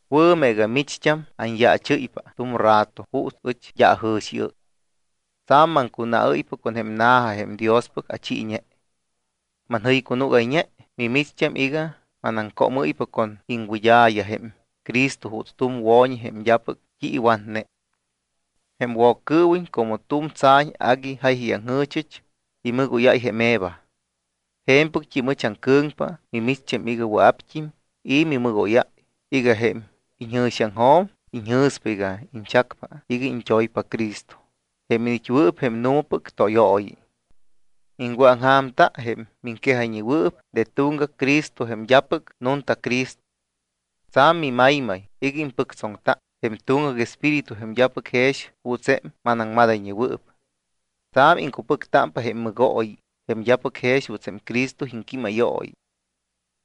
Wɨ̱ meega micht́am anyaachɨ́ypa tu̱m rato juuts ɨch d́a ajɨ̱xiɨ́y. Tsa̱m maŋcunaɨ́ypa con jém na̱ja jém Diospɨc achiiñe. Manjɨycunúgayñe micht́am iga manaŋcómɨ́ypa con iŋwɨd́a̱ya jém Cristo juuts tu̱m wo̱ñi jém d́apɨc t́i iwatne. Jém Woccɨɨwiñ como tu̱m tsa̱ñ agui jáyayaŋjɨ̱chɨch, imɨgóyáy jém Eva. Je̱mpɨct́im ɨch aŋcɨ̱ŋpa mimicht́am iga wɨa̱pt́im i̱ mimɨgóyáy iga jém iñjɨ̱xiaŋjo̱m iñjɨ̱spa iga iñchacpa iga iñt́oypa Cristo, jém iniit́wɨɨp jém nu̱mapɨc tóyooyi. Iŋwɨ̱aŋja̱mta jém miŋquejayñewɨɨp de tuŋgac Cristo jém d́apɨc nunta Cristo. Tsa̱m mimaymay iga impɨctsoŋta jém tuŋgac espíritu jém d́apɨc jex juuts jém manaŋmadayñewɨɨp. Tsa̱m iŋcupɨctámpa jém mɨgooyi jém d́apɨc jex juuts jém Cristo iŋquímayooyi.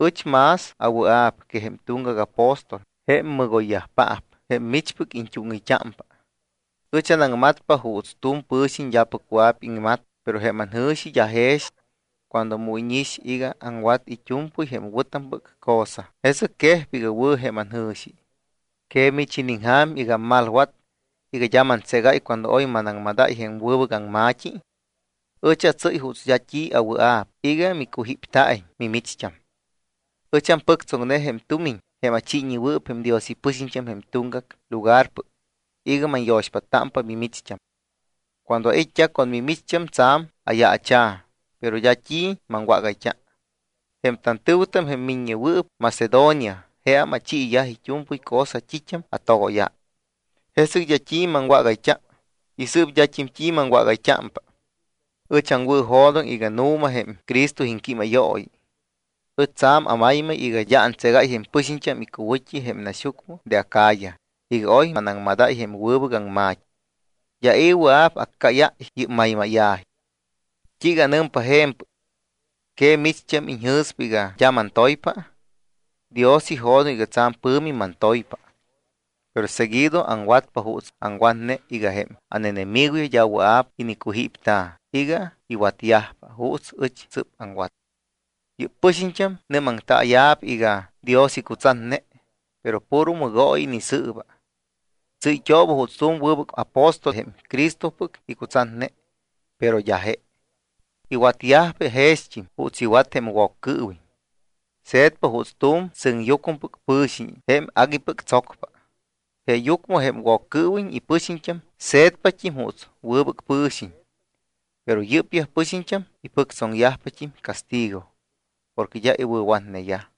Ɨch más awɨa̱p que jém tuŋgac apóstol, jém mɨgoyyajpaap jém michpɨc iñt́úŋɨyt́ámpa. Ɨch anaŋmatpa juuts tu̱m pɨ̱xiñ d́apɨc wɨa̱p iŋmat, pero jém anjɨ̱xi d́a jex. Cuando mu íñix iga aŋwat it́u̱mpɨy jém wɨ̱tampɨc cosa, jesɨc quejpa iga wɨ̱ jém anjɨ̱xi. ¿Que mich iniŋja̱m iga ammalwat iga d́a mantségáy cuando oy manaŋmadáy jém wɨbɨc aŋma̱t́i? Ɨch atsɨ́y juuts d́a t́i awɨa̱p iga micujípta̱iñ mimicht́am. Ɨch ampɨctsoŋne jém tumiñ jém achiiñewɨɨp jém Dios ipɨxiñt́am jém tuŋgac lugarpɨc iga manyo̱xpáttámpa mimicht́am. Cuando ait́t́a con mimicht́am tsa̱m ayaacha̱, pero d́a t́i maŋwágayt́a. Jém tantɨ̱wɨtam, jém miññewɨɨp Macedonia, jeam achiiyaj it́u̱mpɨy cosa t́it́am atogóyáy. Jesɨc d́a t́i maŋwágayt́a y sɨɨp d́at́im maŋwágayt́ámpa. Ɨch aŋwɨ̱jo̱doŋ iga nu̱ma jém Cristo iŋquímayooyi. Ɨch tsa̱m amaymay iga d́a antségáy jém pɨxiñt́am icuwɨ̱t́i jém naxyucmɨ de Acaya iga oy anaŋmadáy jém wɨbɨc aŋma̱t́i. D́a i̱ wɨa̱p accáyáy yɨ́p maymáya̱ji. ¿T́iiga anɨmpa je̱mpɨc? ¿Que micht́am iñjɨ̱spa iga d́a mantoypa? Dios ijo̱doŋ iga tsa̱m pɨ̱mi mantoypa. Pero seguido aŋwatpa juuts aŋwatne iga jém ánenemigoyaj d́a wɨa̱p inicujípta̱ iga iwatyajpa juuts ɨch sɨ́p aŋwat. Yɨ́p pɨxiñt́am nɨ́maŋtaaya̱p iga Dios icutsatne, pero puro mɨgooyi inisɨɨba. Tsɨ́yt́ooba juuts tu̱m wɨbɨc apóstol jém Cristopɨc icutsatne, pero d́a je. Iwatyajpa jext́im juuts iwat jém Woccɨɨwiñ. Se̱tpa juuts tu̱m sɨŋyucmɨpɨc pɨ̱xiñ jém aguipɨc tsocpa. Jeeyucmɨ jém Woccɨɨwiñ ipɨxiñt́am se̱tpat́im juuts wɨbɨc pɨ̱xiñ. Pero yɨ́pyaj pɨxiñt́am ipɨctsoŋyajpat́im castigo porque d́a iwɨ̱watneyaj.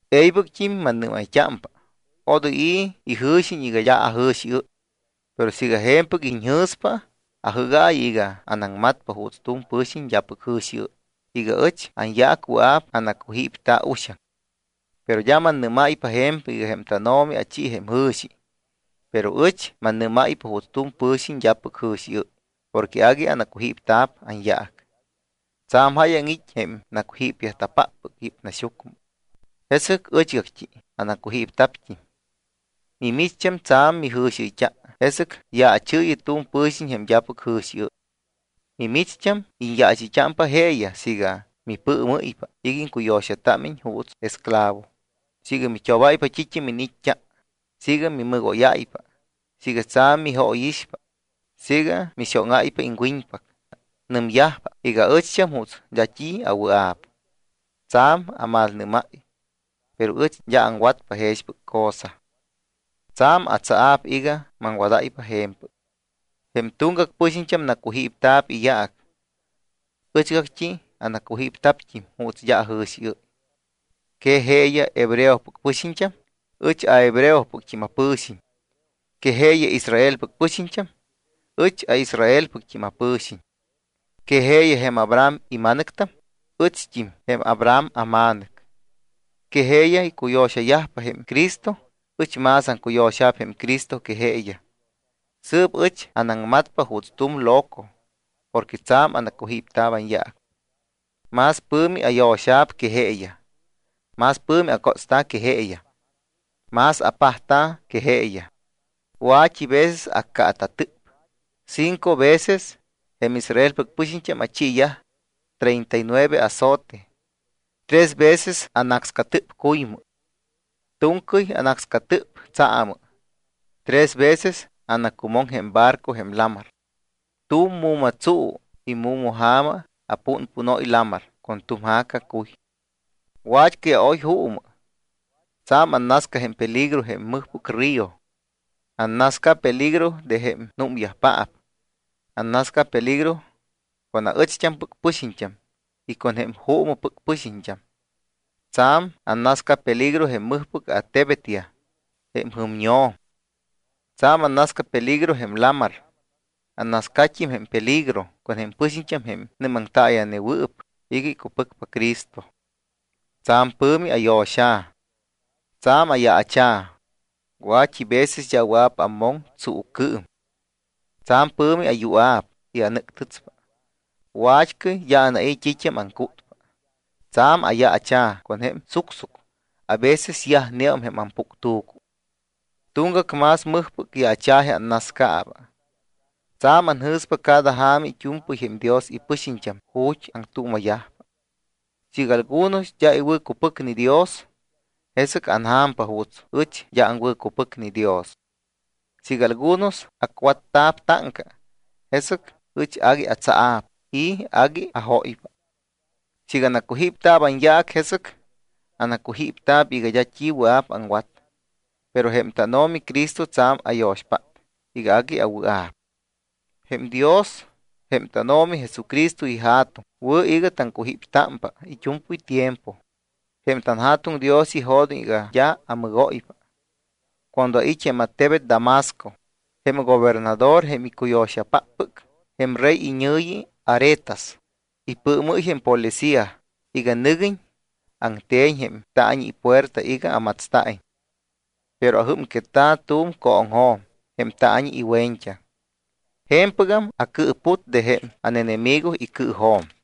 E̱ybɨct́im mannɨ́mayt́ámpa, odoy i̱ ijɨ̱xiñ iga d́a ajɨ̱xiɨ́y. Pero siiga je̱mpɨc iñjɨ̱spa, ajɨ́gaayɨ iga anaŋmatpa juuts tu̱m pɨ̱xiñ d́apɨc jɨ̱xiɨ́y iga ɨch anyaac wɨa̱p anacujípta̱ uxaŋ. Pero d́a mannɨ́máypa je̱mpɨc iga jém tánO̱mi achi jém jɨ̱xi, pero ɨch mannɨ́máypa juuts tu̱m pɨ̱xiñ d́apɨc jɨ̱xiɨ́y porque agui anacujípta̱p anyaac. Tsa̱m jáyaŋ it́ jém nacujípyajta̱páppɨc yɨ́p naxyucmɨ. Jesɨc ɨchgact́i anacujípta̱pt́im. Mimicht́am tsa̱m mijɨ̱xiɨyt́a, jesɨc yaachɨɨyɨ tu̱m pɨ̱xiñ jém d́apɨc jɨ̱xiɨ́y. Mimicht́am iñyaachɨyt́ámpa jeeyaj siiga mipɨɨmɨ́ypa iga iŋcuyo̱xatámiñ juuts esclavo, siiga mit́obáypa t́it́am iniit́t́a, siiga mimɨgóyáypa, siiga tsa̱m mijóyixpa, siiga mixóŋáypa iŋwiñpac. Nɨmyajpa iga aɨcht́am juuts d́a t́i awɨa̱p. Tsa̱m amalnɨ́máy. Pero ɨch d́a aŋwatpa jexpɨc cosa. Tsa̱m atsaa̱p iga maŋwadáypa je̱mpɨc. Jém tuŋgac pɨxiñt́am nacujípta̱p iyaac. Ɨchgact́i anacujípta̱pt́im juuts d́a ajɨ̱xiɨ́y. ¿Que jeeyaj hebreopɨc pɨxiñt́am? Ɨch hebreopɨct́im apɨ̱xiñ. ¿Que jeeyaj Israelpɨc pɨxiñt́am? Ɨch Israelpɨct́im apɨ̱xiñ. ¿Que jeeyaj jém Abraham ima̱nɨctam? Ɨcht́im jém Abraham ama̱nɨc. ¿Que jeeyaj icuyo̱xayajpa jém Cristo? Ɨch más aŋcuyo̱xa̱p jém Cristo que jeeyaj. Sɨɨp ɨch anaŋmatpa juuts tu̱m loco porque tsa̱m anacujípta̱p anyaac. Más pɨ̱mi ayo̱xa̱p que jeeyaj. Más pɨ̱mi acótsta̱ que jeeyaj, más apajta̱ que jeeyaj. Wa̱t́i veces accaata̱tɨp. Cinco veces jém Israelpɨc pɨxiñt́am achiiyaj treinta y nueve azote. Tres veces anácscatɨp cuymɨ. Tu̱ŋcɨy anácscatɨp tsaamɨ. Tres veces anacumoŋ jém barco jém lamar. Tu̱m mu̱ma tsu y mu̱ma ja̱ma apúnpúnóypa lamar con tu̱m ja̱ca cuy. Wat́cɨy aoy juumɨ. Tsa̱m annasca jém peligro jém mɨjpɨc río. Annasca peligro de jém númyajpaap. Annasca peligro con aɨcht́ampɨc pɨxiñt́am y con jém juumɨpɨc pɨxiñt́am. Tsa̱m annasca peligro jém mɨjpɨc attebetyaj y jém jɨmño̱m. Tsa̱m annasca peligro jém lamar. Annascat́im jém peligro con jém pɨxiñt́am jém nɨ́maŋtaaya̱newɨɨp iga icupɨcpa Cristo. Tsa̱m pɨ̱mi ayo̱xa̱, tsa̱m ayaacha̱. Wa̱t́i veces d́a wɨa̱p ammoŋ tsuucɨɨm. Tsa̱m pɨ̱mi ayua̱p y anɨ́ctɨtspa. Wat́cɨy d́a anai̱ t́it́am aŋcútpa. Tsa̱m ayaacha̱ con jém sucsuc. A veces yajneum jém ampuctu̱cu. Tuŋgac más mɨjpɨc yaacha̱ji annascaaba. Tsa̱m anjɨ̱spa cada ja̱ma it́u̱mpɨy jém Dios ipɨxiñt́am ju̱t́ aŋtuuma̱yajpa. Siiga algunos d́a iwɨ̱cupɨcne Dios, jesɨc anja̱mpa juuts ɨch d́a aŋwɨ̱cupɨcne Dios. Siiga algunos acwatta̱p táŋca, jesɨc ɨch agui atsaa̱p y agui ajóypa. Siiga anacujípta̱p anyaac, jesɨc anacujípta̱p iga d́a t́i wɨa̱p aŋwat, pero jém tánO̱mi Cristo tsa̱m ayo̱xpát iga agui awɨa̱p. Jém Dios, jém tánO̱mi Jesucristo iJa̱tuŋ, wɨ̱ iga taŋcujíptámpa it́u̱mpɨy tiempo. Jém tanJa̱tuŋ Dios ijo̱doŋ iga d́a amɨgóypa. Cuando ait́ jém attebet Damasco, jém gobernador jém icuyo̱xapáppɨc jém rey iñɨ̱yi Aretas, ipɨɨmɨ́y jém policía iga nɨguiñ aŋte̱ñ jém taañi ipuerta iga amatsta̱iñ. Pero ajɨ́mquetta̱ tu̱m cooŋjo̱m jém taañi iwe̱ñt́aŋ. Je̱mpɨgam acɨɨput de jém ánenemigo icɨɨjo̱m.